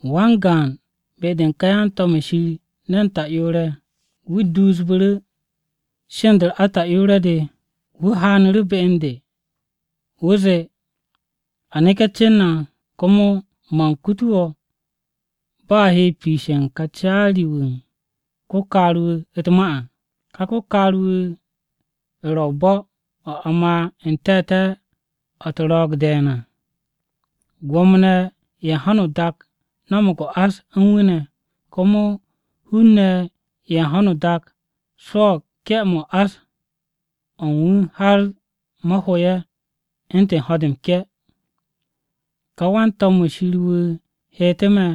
Wan-gaan be-de u̱n ká yan-to̱m-ye̱ Shir ne̱n ta'yoore̱ ye̱, wu̱ duusbe̱ sheend-o ata'yoore̱-o̱, haanu̱ru̱ be u̱n de, wu̱ zee, “A neke̱ cen na, komo man kutu wo̱ bo̱ a he piishe̱ u̱n ka caari-wu̱ u̱n ko-kaar-wu̱ u̱t-ma à. Ka ko-kaar-wu̱ ro̱ o-bo̱ o̱ a ma n-te̱te̱ o̱ u̱t-ro̱o̱g de̱e̱n à. Gwo̱mo-ne̱ ye̱ u̱n ho̱no o-dak no̱mo̱g o-ás u̱n wu̱ ne̱, komo hun-ne̱ ye̱ u̱n ho̱no o-dak swo̱o̱g ke̱-mo̱ u̱n ás-o̱ u̱n wu̱ har mo̱ ho ye̱ u̱ntu̱n ho̱-de m-ke̱.” Ká wan-to̱m-wu̱ Shir wu̱ heetu̱ me̱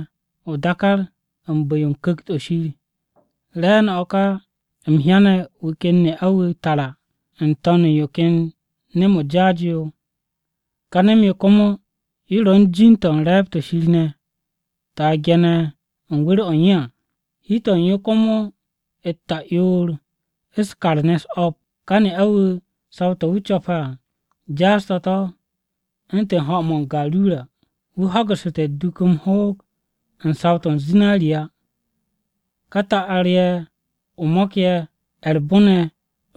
o-dákár u̱n bu̱-yo Ku̱kt-o Shir. Re̱e̱no̱ o̱ ka, u̱m hyane̱ wu̱ ken ne'a-wu̱ tara n-to̱n u̱n yo ken nem-o jaas-yo yo. Ka nem-yo komo yo ro̱ u̱n jin-to̱ u̱n re̱e̱b-to̱ Shir ne̱ to̱ a ge̱ne̱ u̱n wu̱r-o̱ u̱n yo à, hi-to̱ u̱n yo komo u̱t-ta'yoor u̱s-kar ne̱ u̱s-o̱p. Ka ne'a-wu̱ saw-to̱ wu̱ co̱pe̱ à jaas-to̱ to̱ u̱ntu̱n ho̱-mo̱ o-garura, wu̱ ho̱gu̱ssu̱te̱ u̱t-duk m-ho̱o̱g u̱n saw-to̱ u̱n zinariya, u̱n ka ta'ar-ye̱ o-mo̱k ye̱ ne̱ ye̱ u̱r-bon ye̱ ne̱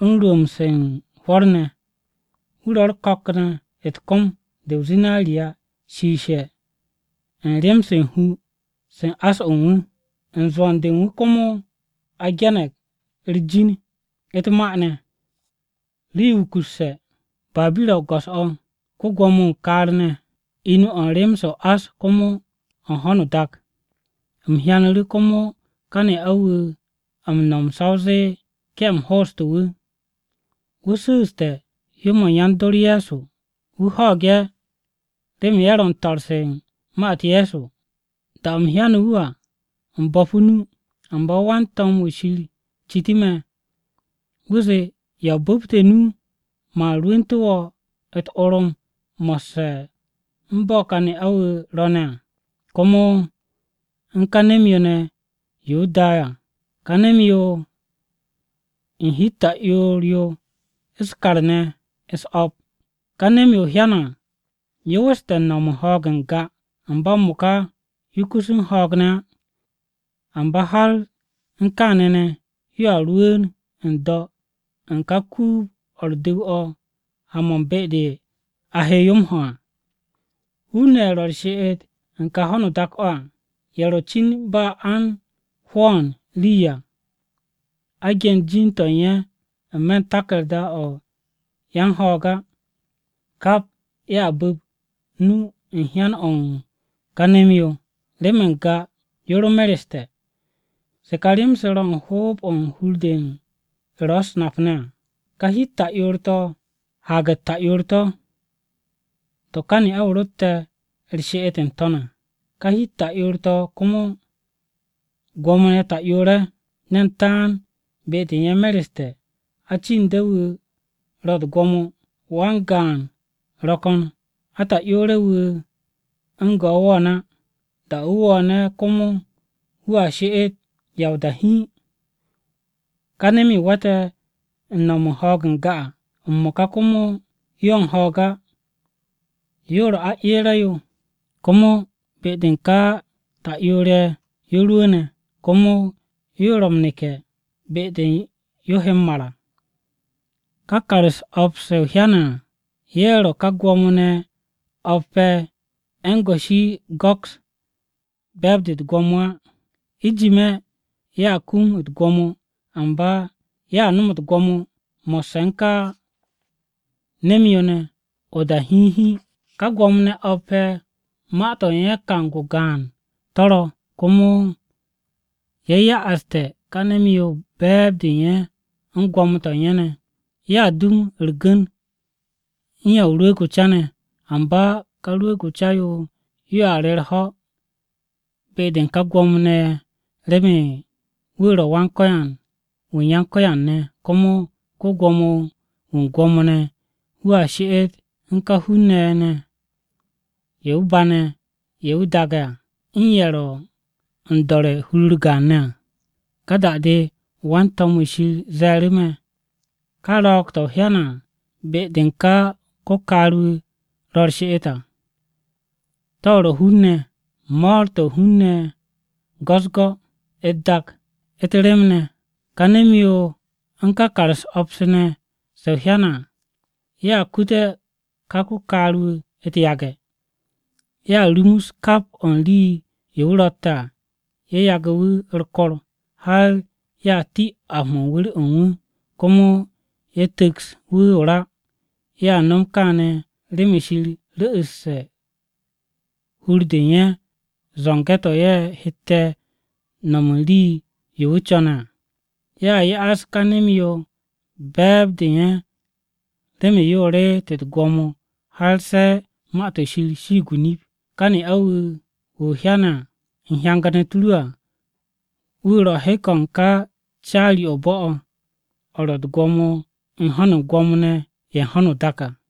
u̱n rwu̱u̱mb-u̱s u̱n hwo̱r ne̱. Wu̱ ro̱ u̱r-ko̱k ne̱ u̱t-kom de o-zinariya shiishe̱ u̱n rem-se u̱n hu-se u̱n ás-o̱ u̱n wu̱. U̱n zwo̱n-de u̱n wu̱ komo a ge̱ne̱g u̱r-jin u̱t-ma ne̱: Rii-yo wukusse̱ Babira-o go̱s-o̱, Ko-gwo̱mo-wu̱ u̱n kaar-ne̱, Inu-o̱ u̱n rem-se o-ás komo u̱n ho̱no o-dak. U̱m hyanu̱ru̱ komo ka ne'a-wu̱ m-no̱m sa o zee ke̱-m hooste̱ wu̱. Wu̱ su̱u̱ste̱ hyó-mo̱ u̱n yan-dor Ye̱so. Wu̱ ho̱o̱g ye̱ remen ye̱ ro̱ u̱n to̱r-se u̱n ma-u̱t Ye̱so. Da-o u̱m hyane̱ wu̱ à, u̱m bo̱pu̱ o-nu. Amba wan-to̱m-wu̱ Shir citu̱ me. Wu̱ zee, “¿Ya o bu̱pte̱ nu? Man rwu̱ntu̱ wo̱ u̱t-orom mo̱sse̱ u̱n bo̱ ka ne'a-wu̱ ro̱ ne̱, komo u̱n ka nem-yo ne̱ yo wu̱ da à, ka nem-yo u̱n hi-u̱t ta'yoor yo u̱s-kar ne̱ u̱s-o̱p. Ka nem-yo o hyane̱ à, yo weste̱ u̱n no̱m u̱n ho̱o̱g n-ga, amba m-mo̱ka yo kus u̱n ho̱o̱g ne̱ á. Amba har u̱n kaane̱ ne̱, yoa rwu̱u̱n n-do̱ u̱n ka kuub-o̱ u̱r-du̱w o̱ ha-mo̱ u̱n be-de a he yo m-ho à. Hun-ne̱ ye̱ ro̱ u̱r-she'et u̱n ka ho̱no o-dak o̱ à, ye̱ ro̱ cin ba a u̱n hwo̱o̱n rii à a ge̱n jin-to̱ u̱n ye̱ n-me̱ u̱n taku̱rda-o̱ yan-ho̱o̱g á, kap ye̱a bu̱p nu u̱n hyan-o̱ u̱n ka nem-yo, remen n-ga yo ro u̱n ho̱o̱g ne̱ amba m-mo̱ka yo mereste̱. “To̱ ka rem-se ro̱ u̱n hoob-o̱ hur-de ro̱ u̱s-nap ne̱ à. Ka hi-u̱t ta'yoor-to̱ haag-u̱t ta'yoor-to̱, to̱ ka ne'a-wu̱ ro̱tte̱ u̱r-she'et n-to̱n à. Ka hi-u̱t ta'yoor-to̱ komo gwo̱mo-ne̱ ta'yoor-ye̱, ne̱n taan be-de u̱n ye̱ mereste̱, acinde̱-wu̱ ro̱ u̱t-gwo̱mo. Wan-gaan ro̱ ko̱n, ata'yoore̱-wu̱ u̱n go̱ wo̱o̱n á. Da-o̱ wu̱ wo̱o̱ne̱, komo wu̱a she'et ya o-da hiin. Ka nem-yo we̱te̱ u̱n no̱m u̱n ho̱o̱g n-ga à, m-mo̱ka komo yo u̱n ho̱o̱g á, yo ro̱ aeere̱-yo. Komo be-de u̱n ka ta'yoor-ye̱ yo rwu̱u̱ne̱, komo yo ro̱ m-neke̱ be-de yo he m-mar à. “Ka kar-u̱s o̱p-se o hyane̱ á, ye̱ ro̱ ka gwo̱mo-ne̱ o̱p-ye̱ ye̱ u̱n goshi go̱kse̱ be̱e̱b-de u̱t-gwo̱mo á. Ijime̱, ye̱a kum u̱t-gwo̱mo. Amba ye̱a no̱m u̱t-gwo̱mo mo̱sse̱ u̱n ka nem-yo ne̱ awa o-gaan. Ka gwo̱mo-ne̱ o̱p-ye̱ ma-to̱ u̱n ye̱ kang-o gaan to̱ ro̱, komo ye̱ ya'aste̱ ka nem-yo be̱e̱b-de u̱n ye̱ u̱n gwo̱mo-to̱ u̱n ye̱ ne̱. Ye̱a gu̱n u̱r-gu̱n u̱n Ya o-Rwu̱u̱g o-Ca ne̱. Amba ka Rwu̱u̱g-o Ca-yo yoa re u̱r-ho̱ be-de u̱n ka gwo̱mo-ne̱ ye̱ remen wu̱ ro̱ Wan-Ko̱yan wu̱ u̱n yan-ko̱yan-ne̱, komo ko-Gwo̱mo-wu̱ u̱n gwo̱mo-ne̱. Wu̱a she'et u̱n ka hun-ne̱ ye̱ ye̱ wu̱ bane̱, u̱n ye̱ wu̱ daagne̱ ne̱ à, u̱n ye̱ ro̱ m-do̱re̱ hur-u̱r gaan ne̱ à.” Ka da-de wan-to̱m-wu̱ Shir ze̱e̱ru̱ me̱, “Ka ro̱o̱g-to̱ o hyane̱ à, be-de ka ko-kaar-wu̱ ro̱ u̱r-she'et à, de ro̱ hun-ne̱, mo̱o̱r-to̱ u̱n hun-ne̱ go̱-u̱s-go̱, u̱t-dak, u̱t-rem ne̱. Ka nem-yo u̱n ka kar-u̱s o̱p ne̱ se o hyane̱ a, ye̱a kute̱ ka ko-kaar-wu̱ u̱t-yage̱. Ye̱a rumus kap o̱ u̱n rii-yo wu̱ ro̱tte̱ à ye̱ yagu̱ wu̱ u̱r-kor. Har ye̱a ti ap-mo̱ u̱n wu̱r-o̱ u̱n wu̱. Komo ye̱ tu̱ks wu̱ o-ra. Ye̱a no̱m kaane̱, remen Shir ru̱'u̱sse̱ u̱n hur-de u̱n ye̱, zo̱nge̱-to̱ ye̱ hette̱ no̱m u̱n rii-yo wu̱ co̱ne̱ à. Ye̱a ya'as ka nem-yo be̱e̱b-de u̱n ye̱ remen yo reet u̱t-gwo̱mo har se̱ Ma-to̱ Shir shiig o-nip. Ka ne'a-wu̱ wu̱ o hyane̱ u̱n hyangan-u̱t ru à, wu̱ ro̱ hek-o̱ u̱n ka caari-o̱ o-bo̱ o̱, o̱ ro̱ u̱t-gwo̱mo u̱n ho̱n u̱n gwo̱mo-ne̱ ye̱ u̱n ho̱no o-dak à.”